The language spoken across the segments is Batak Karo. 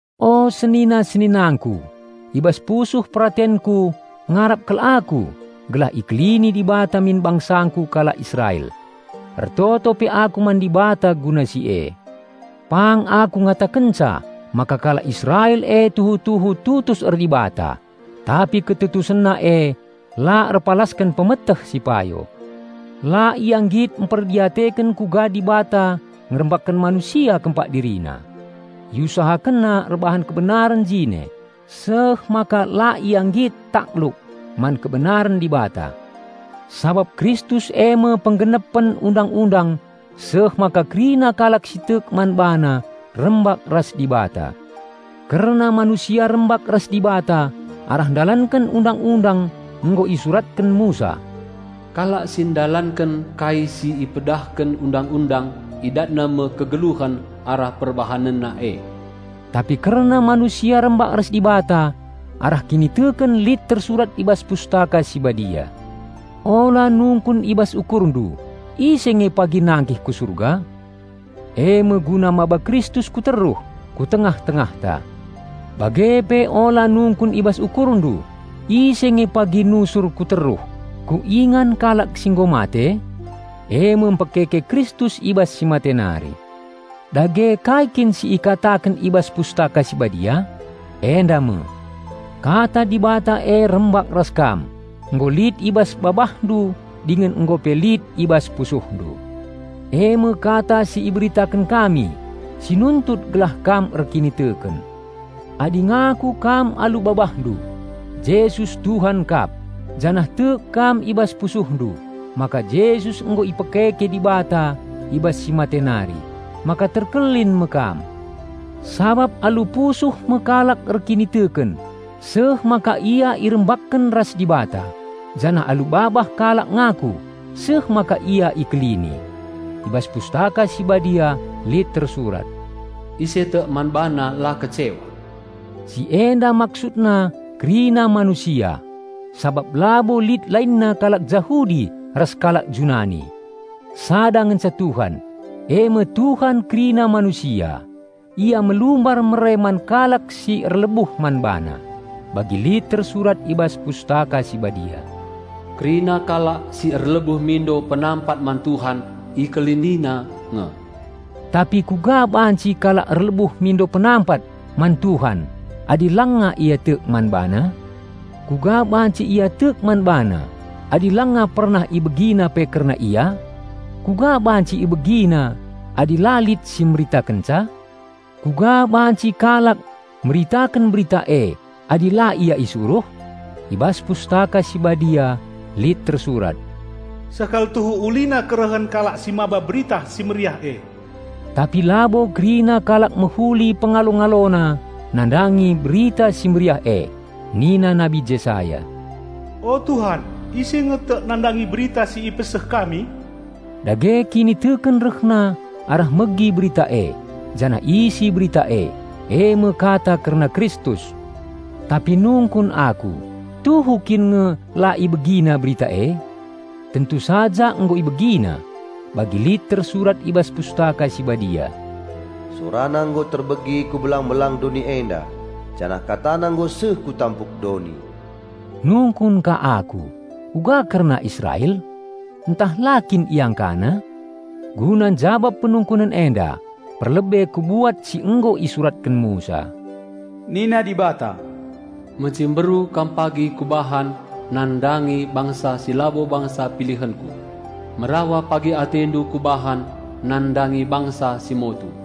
O senina-seninangku, i bas pusuh peratenku ngarap kal aku gelah ikelini Dibata min bangsangku kalak Israel. Ertoto pe aku man Dibata guna si e. Pang aku ngatakenca maka kalak Israel e tuhu-tuhu tutus er-Dibata, tapi ketutusenna e la erpalasken pemeteh si payo. La ia nggit mperdiateken kuga Dibata ngerembakken manusia kempak DiriNa. Iusahakenna erbahan kebenaren jine, seh maka la ia nggit takluk man kebenaren Dibata. Sabap Kristus eme penggenepen Undang-undang seh maka kerina kalak si tek man BaNa rembak ras Dibata. Kerna manusia rembak ras Dibata arah ndalanken Undang-undang nggo isuratken Musa, "Kalak si ndalanken kai si ipedahken Undang-undang idatna me kegeluhen arah perbahanenna e." Tapi kerna manusia rembak ras Dibata arah kiniteken lit tersurat i bas Pustaka Si Badia, "Ula nungkun i bas ukurndu, 'Ise nge pagi nangkih ku Surga?' (eme guna maba Kristus ku teruh, ku tengah-tengahta). Bage pe ula nungkun i bas ukurndu, 'Ise nge pagi nusur ku teruh, ku ingan kalak si nggo mate?' (eme mpekeke Kristus i bas si mate nari)." Dage kai kin si ikataken i bas Pustaka Si Badia? Enda me, "Kata Dibata e rembak ras kam, nggo lit i bas babahndu dingen nggo pe lit i bas pusuhndu" -- eme kata si iberitaken kami, si nuntut gelah kam erkiniteken. Adi ngaku kam alu babahndu, "Jesus Tuhan kap," janah tek kam i bas pusuhndu maka Jesus nggo ipekeke Dibata i bas si mate nari, maka terkelin me kam. Sabap alu musuh me kalak erkiniteken seh maka ia irembakken ras Dibata, janah alu babah kalak ngaku seh maka ia ikelini. I bas Pustaka Si Badia lit tersurat, "Ise tek man BaNa la kecewa." Si enda maksudna kerina manusia, sabap labo lit lainna kalak Jahudi ras kalak Junani. Sada ngenca Tuhan, eme Tuhan kerina manusia. Ia melumbar mere man kalak si erlebuh man BaNa. Bagi lit tersurat i bas Pustaka Si Badia, "Kerina kalak si erlebuh mindo penampat man Tuhan, IkeliniNa nge." Tapi kuga banci kalak erlebuh mindo penampat man Tuhan adi langa ia tek man BaNa? Kuga banci ia tek man BaNa adi langa pernah ibegina pe kerna Ia? Kuga banci ibegina adi la lit si meritakenca? Kuga banci kalak meritaken berita e adi la ia isuruh? I bas Pustaka Si Badia lit tersurat, "Seh kal tuhu ulina kerehen kalak si maba Berita Si Mehuli e." Tapi labo kerina kalak mehuli pengalo-ngalona nandangi Berita Si Mehuli e. Nina Nabi Jesaya, "O Tuhan, ise nge tek nandangi berita si ipeseh kami?" Dage kiniteken rehna arah megi Berita e, janah isi Berita e, eme Kata kerna Kristus. Tapi nungkun aku: Tuhu kin nge la ibegina berita e? Tentu saja nggo ibegina. Bagi lit tersurat i bas Pustaka Si Badia, "Sorana nggo terbegi ku belang-belang doni enda, janah katana nggo seh ku tampuk doni." Nungkun ka aku: Uga kerna Israel? Ntah la kin iangkana? Guna njabap penungkunen enda, perlebe kubuat si nggo isuratken Musa, "Nina Dibata, 'Mecimberu kam pagi Kubahan nandangi bangsa si labo bangsa pilihenKu, merawa pagi atendu Kubahan nandangi bangsa si motu.'"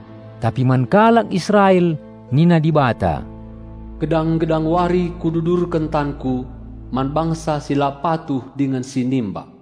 Tapi man kalak Israel, nina Dibata, "Gedang-gedang wari Kududurken tanKu man bangsa si la patuh dingen si nimbak."